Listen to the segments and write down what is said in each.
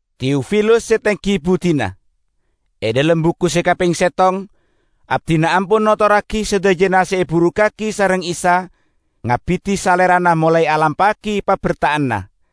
Teofilus se tenggi buddina, E dhalem buku se kapeng settong abdina ampon notorragi sadajana se eburukkagi sareng Isa ngabidi Salerana molae alampa'agi paberta'anna,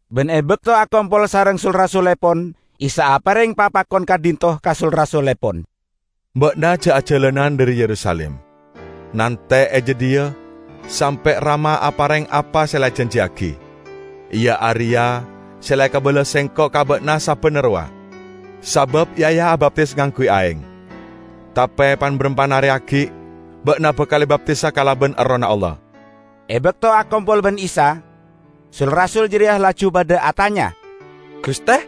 Ban e bakto akompol sareng sul-rasullepon Isa apareng papakon ka'dhinto' ka sul-rasullepon, "Ba'na ja' ajalanan dhari Yerusalim. Nante' e jadhiya sampe' Rama apareng apa se la ejanjiyagi, iya areya se la ekabala Sengko' ka ba'na sabbanna rowa. Sabab Yahya abaptis ngangguy aeng, tape pan-barampan are aggi' ba'na bakal ebaptisa kalaban Errohna Allah." E bakto akompol ban Isa, sul-rasul jareya laju padha atanya, "Guste,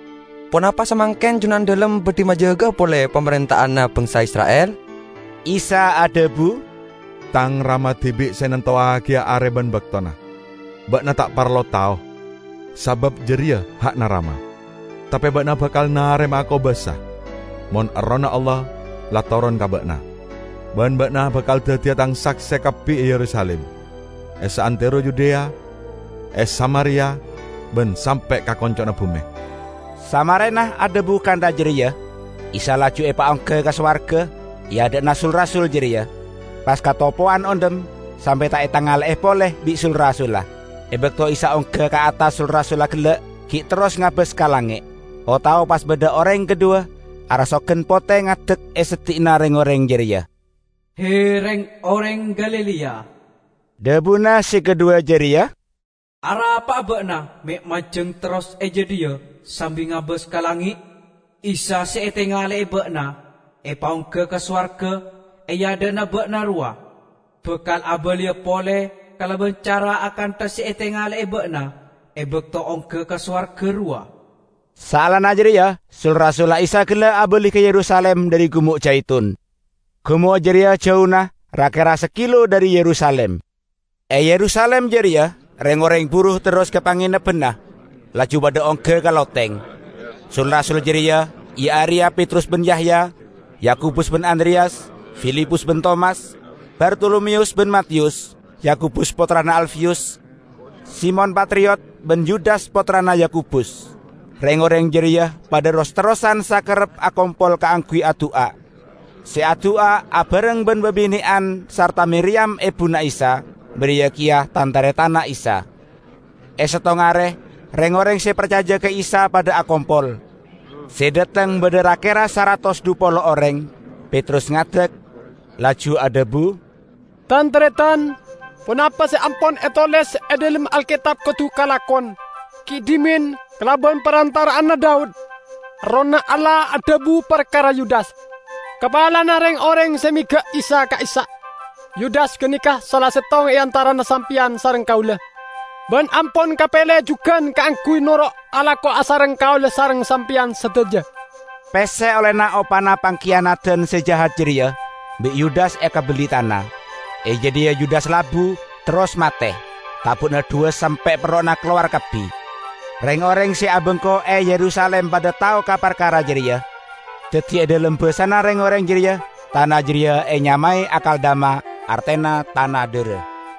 ponapa samangken Junandalem badhi majaga'a pole pamarenta'anna bangsa Isra'il?" Isa adhabu, "Tang Rama dibi' se nantowagiya are ban baktona. Ba'na ta' parlo tao, sabab jareya ha'na Rama. Tape ba'na bakal narema'a kobasa mon Errohna Allah la toron ka ba'na. Ban ba'na bakal daddiya Tang sakse kabbi e Yerusalim, e saantero Yudea e Samaria ban sampe' ka konco'na bume." Samarena adhabu kantha jareya Isa laju epaongga ka sowarga e adha'na sul-rasul jareya, pas katopowan ondhem sampe' ta' etangale'e pole bi' sul-rasulla. E bakto Isa ongga ka attas sul-rasulla gella' gi' terros ngabas ka langnge', o-tao pas badha oreng kadhuwa arasogan pote ngadek e seddi'na reng-oreng jareya. "He, reng-oreng Galilea," dhabuna se kadhuwa jareya, "arapa'a ba'na me' manjeng terros e jadhiya sambi ngabas ka langnge'? Isa se etangale'e ba'na epaongga ka sowarga e adha'na ba'na rowa, bakal abaliya pole kalaban cara akantha se etangale'e ba'na e bakto ongga ka sowarga rowa." Saellana jareya sul-rasulla Isa gella' abali ka Yerusalim dhari Gumo' Jaitun. Gumo' jareya jauna ra-kera sakilo dhari Yerusalim. E Yerusalim jareya reng-oreng buru terros ka pangenebbanna, laju padha ongga ka loteng. Sul-rasul jareya iya areya Petrus ban Yahya, Yakobus ban Andreyas, Filipus ban Tomas, Bartolomeyus ban Matiyus, Yakobus pottrana Alfeyus, Simon Patriyot ban Yudas pottrana Yakobus. Reng-oreng jareya padha ros-terrosan sakarep akompol kaangguy adu'a; se adu'a abareng ban babine'an sarta Miriyam ebuna Isa, bariya keya tan-taretanna Isa. E settong are reng-oreng se parcaja ka Isa padha akompol -- se dhateng badha ra-kera saratos dhu polo oreng -- Petrus ngadek, laju adhabu, "Tan-taretan! Ponapa se ampon etoles e dhalem Alketab kodu kalakon. Gi' dhimen, kalaban parantara'anna Daud, Errohna Allah adhabu parkara Yudas, kapalana reng-oreng se mega' Isa ka'issa'. Yudas ganeka sala settong e antarana sampeyan sareng kaula, ban ampon kapele jugan kaangguy noro' alako asareng kaula sareng sampeyan sadaja." ( Pesse ollena opana pangkiyanadan se jahat jareya, bi' Yudas ekabelli tana. E jadhiya Yudas labu, terros mate; tabu'na dhuwas sampe' perro'na kalowar kabbi. Reng-oreng se abengko e Yerusalim padha tao ka parkara jareya. Daddi e dhalem basana reng-oreng jareya tana jareya enyamae Akeldama, artena 'Tana Dhara'.)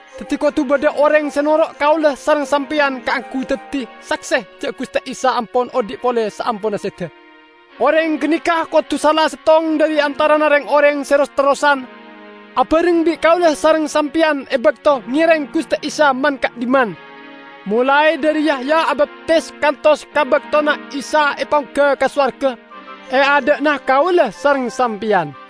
Daddi kodu badha oreng se noro' kaula sareng sampeyan kaangguy daddi sakse ja' Guste Isa ampon odhi' pole saamponna seda. Oreng ganeka kodu sala settong dhari antarana reng-oreng se ros-terrosan abareng bi' kaula sareng sampeyan e bakto ngereng Guste Isa man-ka'dhimman, molae dhari Yahya abaptis kantos ka baktona Isa epaongga ka sowarga e adha'na kaula sareng sampeyan."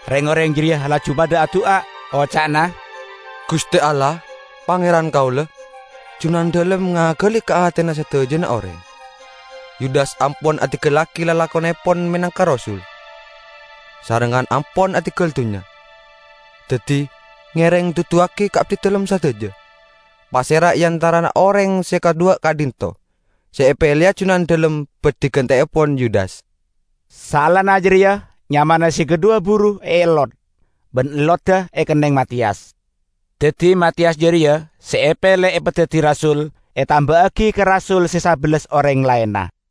Reng-oreng jareya laju padha adu'a, oca'na, "Guste Allah, Pangeran kaula, Junandalem ngagali ka atena sadajana oreng. Yudas ampon adinggallagi lalakonnepon menangka rasul, sarengngan ampon adinggal dunnya. Daddi, ngereng duduwagi ka abdidalem sadaja, pasera e antarana oreng se kadhuwa ka'dhinto' se epeleya Junandalem badhi ganteepon Yudas." Saellana jareya nyamana se kadhuwa buru eellot, ban ellodda ekenneng Matiyas. Daddi Matiyas jareya se epele epadaddi rasul, etamba'agi ka rasul se sabellas oreng laenna.